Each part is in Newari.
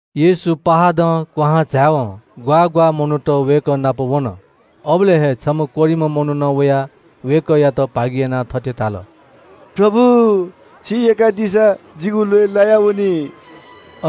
येशू पहाडं क्‍वहां झाय्‌वं ग्‍वाः ग्‍वाः मनूत वय्‌कः नाप वन। अबलय् हे छम्‍ह कोह्रिम्‍ह मनुखं वयाः वय्‌कःयात भागियानाः थथे धाल – “प्रभु, छिं यय्‌कादीसा जितः शुद्ध यानादी फु।”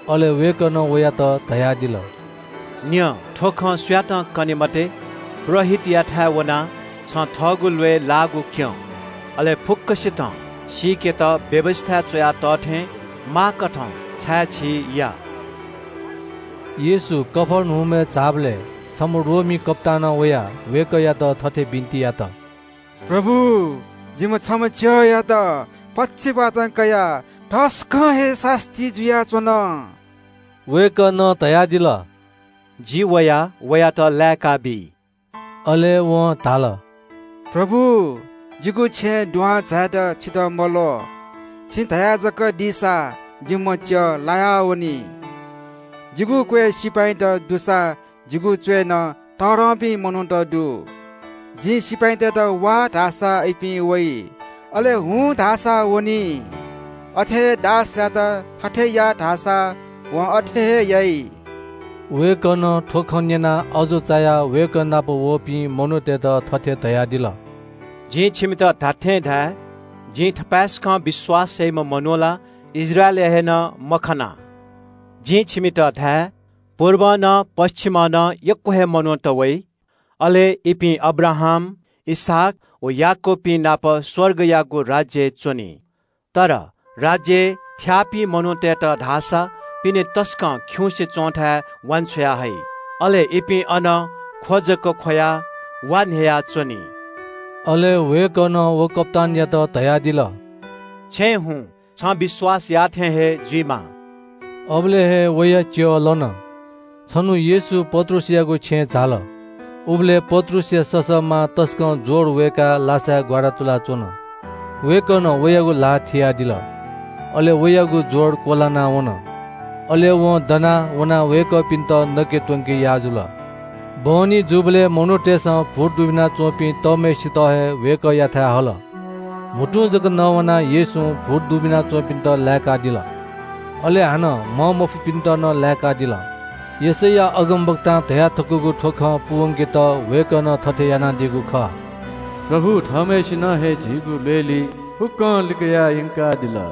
अले वय्‌कलं वयात धयादिल – “न्‍यँ, थ्‍व खँ सुयातं कने मते। पुजाहारीतय्‌थाय् वनाः छं थःगु ल्‍वय् लाःगु क्‍यँ। अले फुक्‍कसितं सीकेत व्‍यवस्‍थाय् च्‍वया तः थें माःकथं छाय्‌छी या।” येशू कफर्नहुमय् झाःबलय् छम्‍ह रोमी कप्‍तानं वयाः वय्‌कःयात थथे बिन्‍ति यात – “प्रभु, जिम्‍ह छम्‍ह च्‍यःयात पक्षवातं कयाः तसकं हे सास्‍ती जुयाच्‍वन।” वय्‌कलं धयादिल – “जि वयाः वयात लाय्‌काबी।” अले वं धाल – “प्रभु, जिगु छेँय् दुहां झायेत छितः मल्‍वः। छिं धया जक दीसां जिम्‍ह च्‍यः लायावनी। जिगु क्‍वय् सिपाइँत दुसां जिगु च्‍वय्‌नं तःधंपिं मनूत दु। जिं सिपाइँतय्‌त ‘वा’ धाःसा इपिं वइ। अले ‘हुँ’ धाःसा वनी। अथे हे दासयात ‘थथे या’ धाःसा वं अथे हे याइ।” वय्‌कलं थ्‍व खँ न्‍यनाः अजू चायाः वय्‌कः नाप वःपिं मनूतय्‌त थथे धयादिल – “जिं छिमित धात्‍थें धाये – जिं थपाय्‌सकं विश्‍वास याइम्‍ह मनू ला इस्राएलय् हे नं मखना। जिं छिमित धाये – पुर्ब व पच्‍छिमं यक्‍व हे मनूत वयाः अब्राहाम, इसहाक व याकूबपिं नाप स्‍वर्गयागु राज्‍यय् च्‍वनी। राज्‍यय् थ्‍याःपिं मनूतय्‌त धाःसा पिने तसकं खिउँसे च्‍वंथाय् वान्‍छ्वया हइ। अले इपिं अन ख्‍व जक ख्‍वयाः वा न्‍ह्ययाच्‍वनी।” अले वय्‌कलं व कप्‍तानयात धयादिल – “छेँय् हुँ छ, छं विश्‍वास याःथें हे जुइमा।” अबलय् हे वया च्‍यः लन। छन्‍हु येशू पत्रुसयागु छेँय् झाल। उबलय् पत्रुसया ससःमां तसकं ज्‍वर वय्‌काः लासाय् ग्‍वारातुलाच्‍वन। वय्‌कलं वयागु ल्‍हाः थियादिल। अले वयागु ज्‍वर क्‍वलाना वन। अले वं दनाः वय्‌कःपिन्‍त नके त्‍वंके याः जुल। बहनी जूबलय् मनूतय्‌सं भूत दुबिना च्‍वंपिं तःम्‍हय्‌सित हे वय्‌कःयाथाय् हल। म्‍हुतुं जक नवानाः येशूं भूत दुबिना च्‍वंपिन्‍त लाय्‌कादिल, अले हानं म्‍हंमफुपिन्‍त नं लाय्‌कादिल। यशैया अगमवक्तां धयाथकूगु खँ पूवंकेत वय्‌कलं थथे यानादीगु खः – “प्रभु थःम्‍हय्‌सिनं हे झीगु ल्‍वय्‌ली फुक्‍कं लिकयाः यंकादिल।”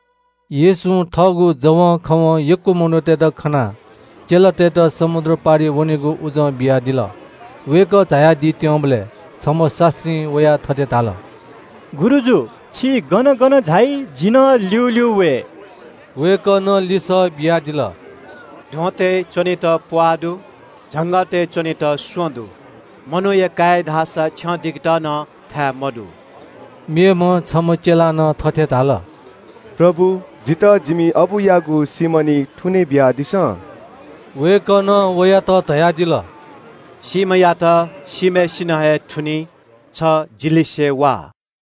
येशूं थःगु जवंखवं यक्‍व मनूतय्‌त खनाः चेलातय्‌त समुद्र पारि वनेगु उजं बियादिल। वय्‌कः झायादीत्‍यंबलय् छम्‍ह शास्‍त्रीं वयाः थथे धाल – “गुरुजु, छि गन गन झाइ जि नं ल्‍यूल्‍यू वये।” वय्‌कलं लिसः बियादिल – “ध्‍वंतय् च्‍वनेत प्‍वाः दु, झंगःतय् च्‍वनेत स्‍वँ दु, मनूया काय्‌या धाःसा छ्यं दिकेत नं थाय् मदु।” मेम्‍ह छम्‍ह चेलां नं थथे धाल – “प्रभु, जितः जिमि अबुयागु सीम्‍ह निं थुने बियादिसँ।” वय्‌कलं वयात धयादिल – “सीम्‍हयात सीम्‍हय्‌सिनं हे थुनी। छ जि लिसे वा।”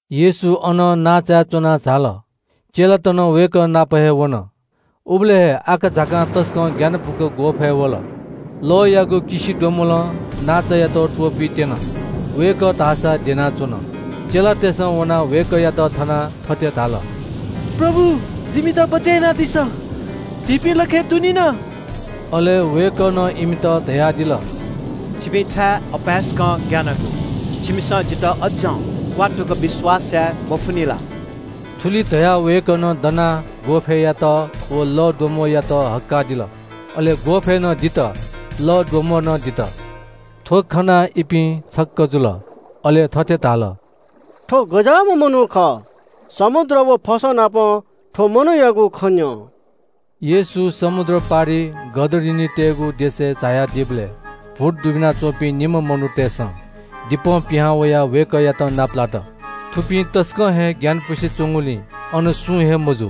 येशू अनं नांचाय् च्‍वनाः झाल। चेलात नं वय्‌कः नाप हे वन। उबलय् हे आकाझाकां तसकं ग्‍यानापुक ग्‍वःफय् वल। लःयागु किसिद्वम्‍बलं नांचायात त्‍वपुइत्‍यन। वय्‌कः धाःसा द्यनाच्‍वन। चेलातय्‌सं वनाः वय्‌कःयात थनाः थथे धाल – “प्रभु, जिमित बचय् यानादिसँ। जिपिं लखय् दुनिन।” अले वय्‌कलं इमित धयादिल – “छिपिं छाय् अपाय्‌सकं ग्‍यानागु? छिमिसं जितः अज्‍जं क्‍वात्तुक विश्‍वास याये मफुनि ला?” थुलि धयाः वय्‌कलं दनाः ग्‍वःफय्‌यात व लःद्वम्‍बःयात हक्‍कादिल। अले ग्‍वःफय् दित, लःद्वम्‍बः नं दित। थ्‍व खनाः इपिं छक्‍क जुल। अले थथे धाल – “थ्‍व गज्‍याःम्‍ह मनू खः? समुद्र व फसंनापं थ्‍व मनूयागु खँ न्‍यं।” येशू समुद्र पारिइ गदरिनीतय्‌गु देशय् झायादीबलय् भूत दुबिना च्‍वंपिं निम्‍ह मनूतय्‌सं दिपं पिहां वयाः वय्‌कःयात नापलात। थुपिं तसकं हे ग्‍यानपुसे च्‍वंगुलिं अनं सुं हे मजू।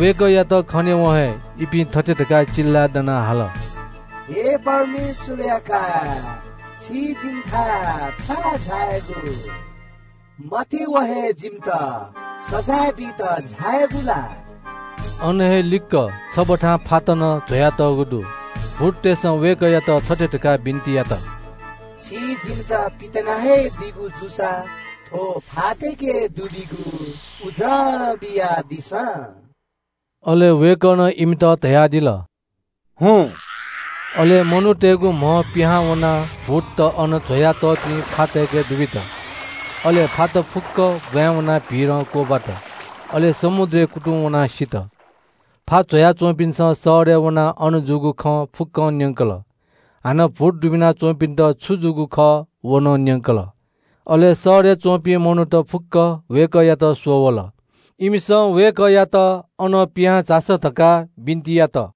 वय्‌कःयात खनेवं हे इपिं थथे धकाः चिल्‍लाय् दनाः हाल – “हे परमेश्‍वरया काय्, छि जिमिथाय् छाय् झायागु? मत्‍यवं हे जिमित सजाँय बीत झायागु ला?” अन हे लिक्‍क छबथां फात नं ज्‍वया तःगु दु। भूततय्‌सं वय्‌कःयात थथे धकाः बिन्‍ति यात – “छिं जिमित पितिना हे दीगु जूसा थ्‍व फातय्‌के दुबीगु उजं बियादिसँ।” अले वय्‌कलं इमित धयादिल – “हुँ।” अले मनूतय्‌गु म्‍हं पिहां वनाः भूतत अन ज्‍वयातःपिं फातय्‌के दुबित। अले फात फुक्‍क ब्‍वाँय् वनाः भीरं क्‍वब्‍वात। अले समुद्रय् कुतुं वनाः सित। फा ज्‍वयाच्‍वंपिन्‍सं शहरय् वनाः अन जूगु खँ फुक्‍कं न्‍यंकल। भूत दुबिना च्‍वंपिन्‍त छु जूगु खः व नं न्‍यंकल। अले शहरय् च्‍वंपिं मनूत फुक्‍क वय्‌कःयात स्‍वः वल। इमिसं वय्‌कःयात अनं पिहां झासँ धकाः बिन्‍ति यात।